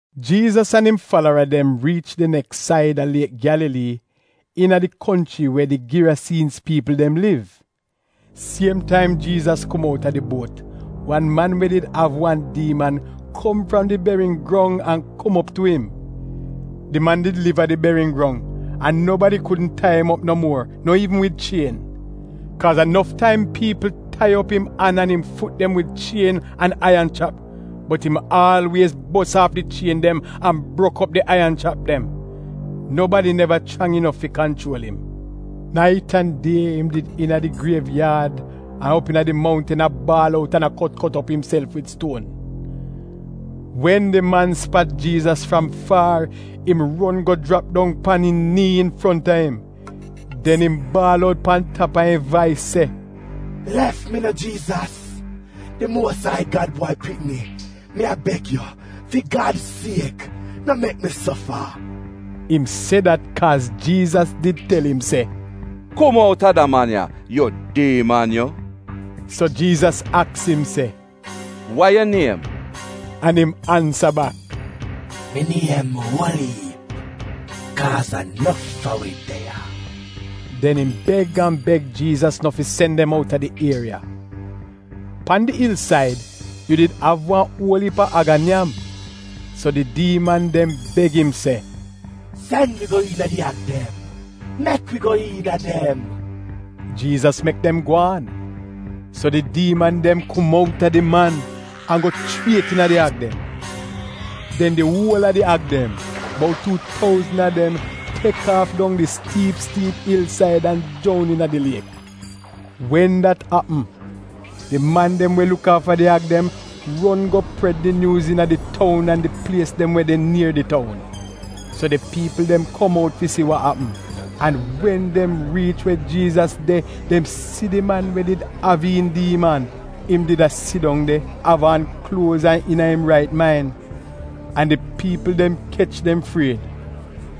Jiizas an im falara dem riich di neks saida Liek Gyalalii, iina di konchri we di Girasiinz piipl dem liv. Siem taim Jiizas kom outa di buot, wan man we did av wan diiman, kom fram di beriyin grong an kom op tu im. Di man did liv a di beriyin grong, an nobadi kudn tai im op no muor, no iivn wid chien. Kaaz a nof taim piipl tai op im an an im fut dem wid chien an aiyan chrap, bot im aalwiez bos aaf di chien dem an brok op di aiyan chrap dem. Nobadi neva chrang inof fi kanchuol im. Nait an die im did de iina di griev yaad an op iina di mountn a baal out an kot kot op imself wid stuon. Wen di man spat Jiizas fram faar, im ron go jrap dong pan im nii infronta im. Den im baal out pan tap a im vais se, “Lef mi no Jiizas, di Muos Ai Gad Bwai Pikni! Mi a beg yu, fi Gad siek, no mek mi sofa!” Im se dat kaaz Jiizas did tel im se, “Kum outa da man ya, yu diiman yu!” So Jiizas aks im se, “Wa yu niem?” An im ansa bak, “Mi niem ‘Uol-iip’, kaaz a nof a wi de ya.” Den im beg an beg Jiizas nof fi sen dem outa di ieriya. Pan di il-said, yu did av wan uol iip a ag a nyam. So di diiman dem beg im se, “Sen wi go iina di ag dem. Mek wi go iina dem.” Jiizas mek dem gwaan. So di diiman dem kom outa di man, an go chriet iina di ag dem. Den di uol a di ag dem, bout tuu touzn a dem, tek aaf dong di stiip stiip il-said an joun iina di liek. Wen dat apm, di man dem we luk aafa di ag dem ron go pred di nyuuz iina di toun an di plies dem we de nier di toun. So di piipl dem kom out fi si wa apm. An wen dem riich we Jiizas de, dem si di man we did av iin diiman. Im did a sidong de, av aan kluoz an iina im rait main. An di piipl dem kech dem fried.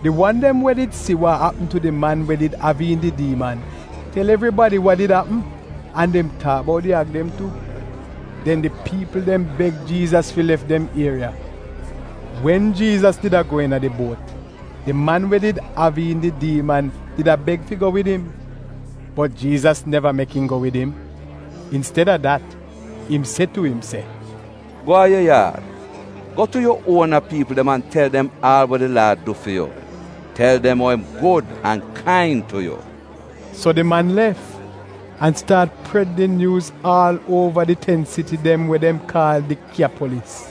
Di wan dem we did si wa apm tu di man we did av iin di diiman, tel evribadi wa did apm, an dem taak bout di ag dem tu. Den di piipl dem beg Jiizas fi lef dem ieriya. Wen Jiizas did a go iina di buot, di man we did av iin di diiman did a beg fi go wid im. Bot Jiizas neva mek im go wid im. Insted-a dat, im se tu im se, “Go a yu yaad, go tu yu uona piipl dem an tel dem aal wa di Laad du fi yu. Tel dem ou im gud an kain tu yu.” So di man lef an staat pred di nyuuz aal uova di ten siti dem we dem kaal Dikyapolis.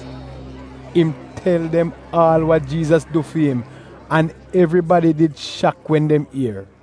Im tel dem aal wa Jiizas du fi im, an evribadi did shak wen dem ier.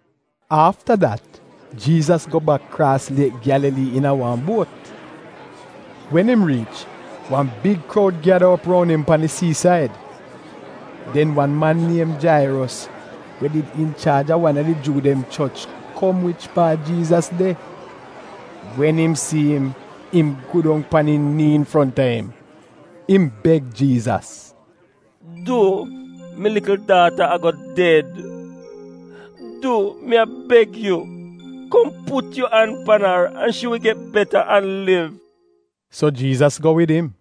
Afta dat Jiizas go bak kraas Liek Gyalalii iina wan buot. Wen im riich, wan big kroud gyada op roun im pan di sii-said. Den wan man niem Jairos we did inchaaj a wan a di Juu dem choch, kom wich paat Jiizas de. Wen im si im, im go dong pan im nii infronta im. Im beg Jiizas, “Du, mi likl daata a-go ded! Du, mi a beg yu, kom put yu an pan ar an shi wi get beta an liv.” So Jiizas go wid im.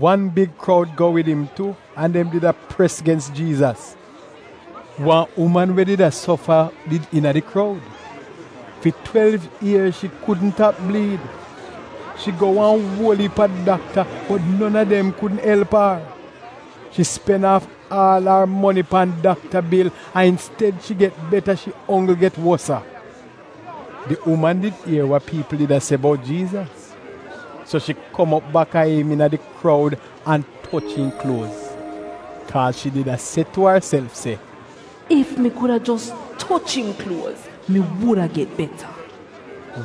Wan big kroud go wid im tu an dem did a pres aad gens Jiizas. Wan uman we did a sofa did iina di kroud. Fi twelv ier shi kudn tap bliid. Shi go wan uol iip a dakta, bot non a dem kudn elp ar. Shi spen aaf aal ar moni pan dakta bil, an insted-a shi get beta, shi onggl get wosa. Di uman did ier wa piipl did a se bout Jiizas, so shi kom op baka im iina di kroud an toch im kluoz. Kaaz shi did a se tu arself se, “Ef mi kuda jos toch im kluoz, mi wuda get beta.”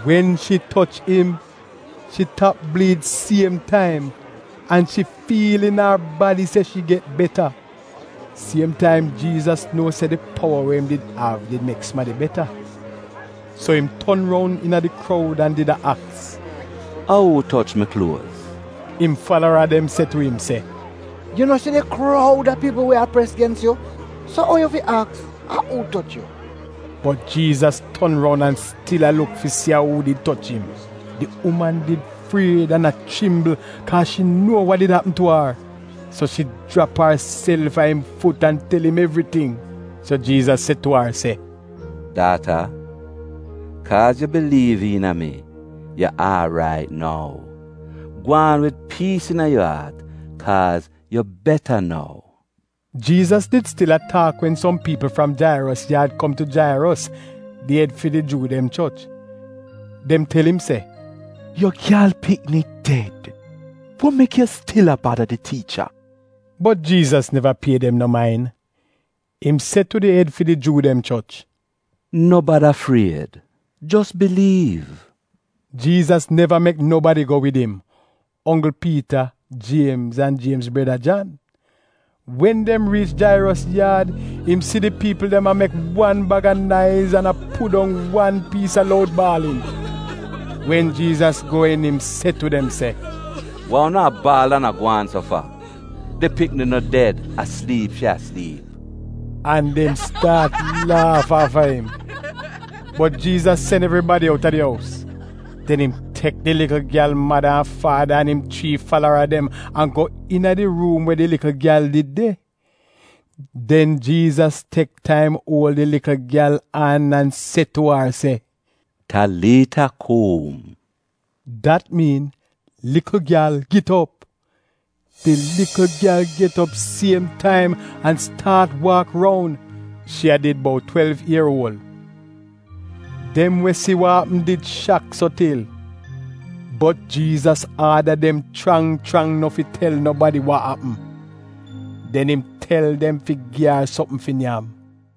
Wen shi toch im, shi tap bliid siem taim, an shi fiil iina ar badi se shi get beta. Siem taim Jiizas nuo se di powa we im av did mek sumadi beta. So im ton roun iina di kroud an did a aks, “A uu toch mi kluoz?” Im falara dem se tu im se, “Yu no si di kroud a piipl we a pres gens yu? So ou yu fi aks a uu toch yu?” Bot Jiizas ton roun an stil a luk fi si a uu did toch im. Di uman did fried an a chrimbl, kaaz shi nuo wa did apm tu ar. So shi jrap arself a im fut an tel im evriting. So Jiizas se tu ar se, “Daata, kaaz yu biliiv iina mi, yu aarait nou. Gwaan wid piis iina yu aat, kaaz yu beta nou.” Jiizas did stil a taak wen som piipl fram Jairos yaad kom tu Jairos — di ed fi di Juu dem choch. Dem tel im se, “Yu gyal pikni ded! Wa mek yu stil a bada di tiicha?” Bot Jiizas neva pie dem no main. Im se tu di ed fi di Juu dem choch, “No bada fried, jos biliiv.” Jiizas neva mek nobadi go wid im, onggl Piita, Jiemz an Jiemz breda, Jan. Wen dem riich Jairos yaad, im si di piipl dem a mek wan bag a naiz an a pudong wan piis a loud baalin. Wen Jiizas go iin im se tu dem se, “Wa unu a baal an a gwaan so fa? Di pikni no ded; a sliip shi a sliip.” An dem staat laaf aafa im. Bot Jiizas sen evribadi outa di ous. Den im tek di likl gyal mada an faada an im chrii falara dem an go iina di ruum we di likl gyal did de. Den Jiizas tek taim uol di likl gyal an an se tu ar se, “Taliita kum!” Dat miin, “Likl gyal, git op!” Di likl gyal get op siem taim an staat waak roun (shi a did bout twelv ier uol). Dem we si wa apm did shak so til. Bot Jiizas aada dem chrang chrang no fi tel nobadi wa apm. Den im tel dem fi gi ar sopm fi nyam.